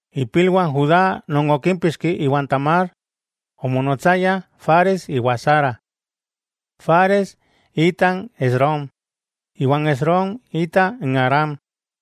Ipilwah n Judá non okímpixki iwan Tamar, omonotsayah Fares iwa Zara. Fares ita n Esrom, iwa n Esrom ita n Aram.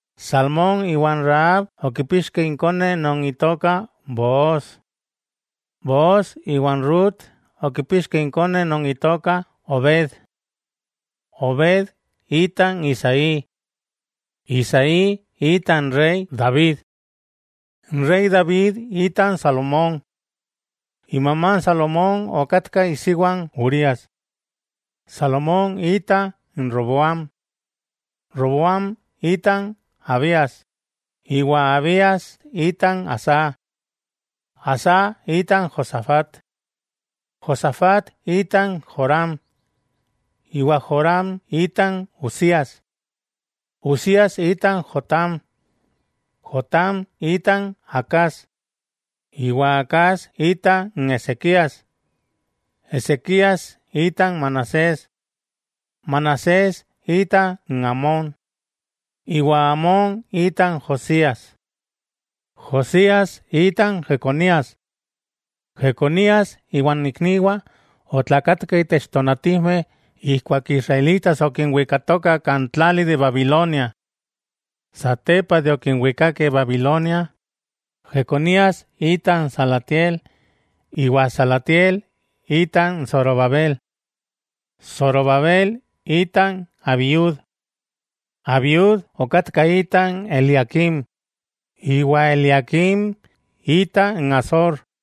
Salmón iwa n Rahab okipixkeh inkone non itoka Booz. Booz iwa n Rut okipixkeh inkone non itoka Obed. Obed ita n Isaí. Isaí ita n rey David. N rey David ita n Salomón. Imamá n Salomón okatka isiwa n Urías. Salomón ita n Roboam. Roboam ita n Abías, iwa Abías ita n Asá. Asá ita n Josafat. Josafat ita n Joram, iwa Joram ita n Uzias. Uzias ita n Jotám. Jotám ita n Acaz, iwa Acaz ita n Ezequías. Ezequías ita n Manasés. Manasés ita n Amón, iwa Amón ita n Josías. Josías ita n Jeconías. Jeconías iwan ikniwah otlakatkeh itech tonatijmeh ijkuak n israelitas okinwikatokah kan tlali de Babilonia. Satepa de okinwikakeh Babilonia, Jeconías ita n Salatiel, iwa Salatiel ita n Zorobabel. Zorobabel ita n Abiud. Abiud okatka ita n Eliaquim, iwa Eliaquim ita n Azor.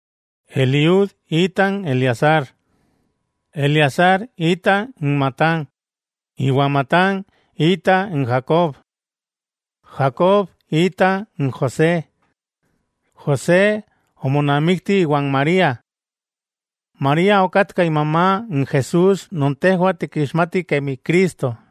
Eliud ita n Eleazar. Eleazar ita n Matán, iwa Matán ita n Jacob. Jacob ita n José. José omonamikti iwan María. María okatka imamá n Jesús non tejwah tikixmatih kemi Cristo.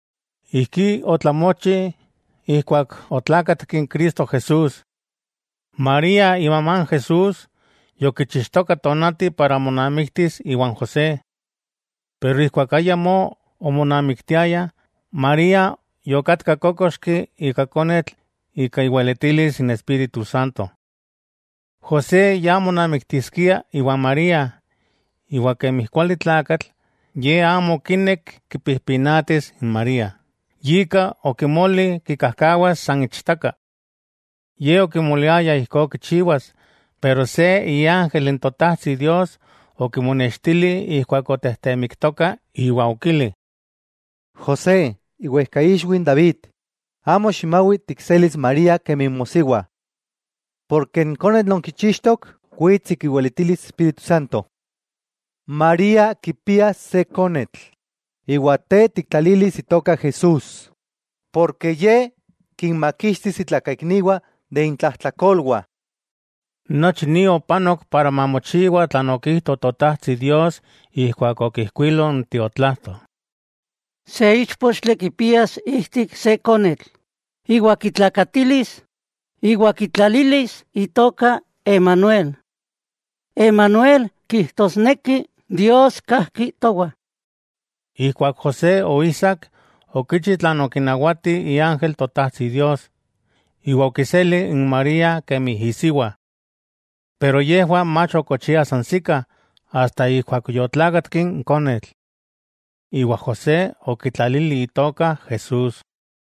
Ijkí otlamochi ijkuak otlákatki n Cristo Jesús. María, imamá Jesús, yokichixtoka tonati para monamiktis iwan José. Pero ijkuak ayamó omonamiktiayah, María yokatka kókoxki ika konetl ika iweletilis n Espíritu Santo. José ya monamiktiskia iwan María, iwa kemi kuali tlakatl, ye amo okinek kipijpinatis n María, yika okimoli kikajkawas san ichtaka. Ye okimoliaya ijkó kichiwas, pero se iángel n Totajtsi Dios okimonextili ijkuak otejtemiktoka iwa okili: —José, iwejkaixwi n David, amo ximawi tikselis n María kemi mosiwa. N konetl non kichixtok wits ika iweletilis Espíritu Santo. María kipias se konetl, iwa te tiktlalilis itoka JESÚS, Ye kinmakixtis itlakaikniwah de intlajtlakolwah. Nochi ni opanok para mamochiwa tlan okijto Totajtsi Dios ijkuak okijkuilo n tiotlajto: Se íchpochtli kipias ijtik se konetl, iwa kitlakatilis, iwa kitlalilis itoka Emanuel. Emanuel kijtosneki: Dios kajki towah. Ijkuak José oijsak, okichi tlan okinawati iángel Totajtsi Dios, iwa okiseli n María kemi isiwa. Yejwah mach okochiah sansikah, asta ijkuak yotlákatki n konetl. Iwa José okitlalili itoka Jesús.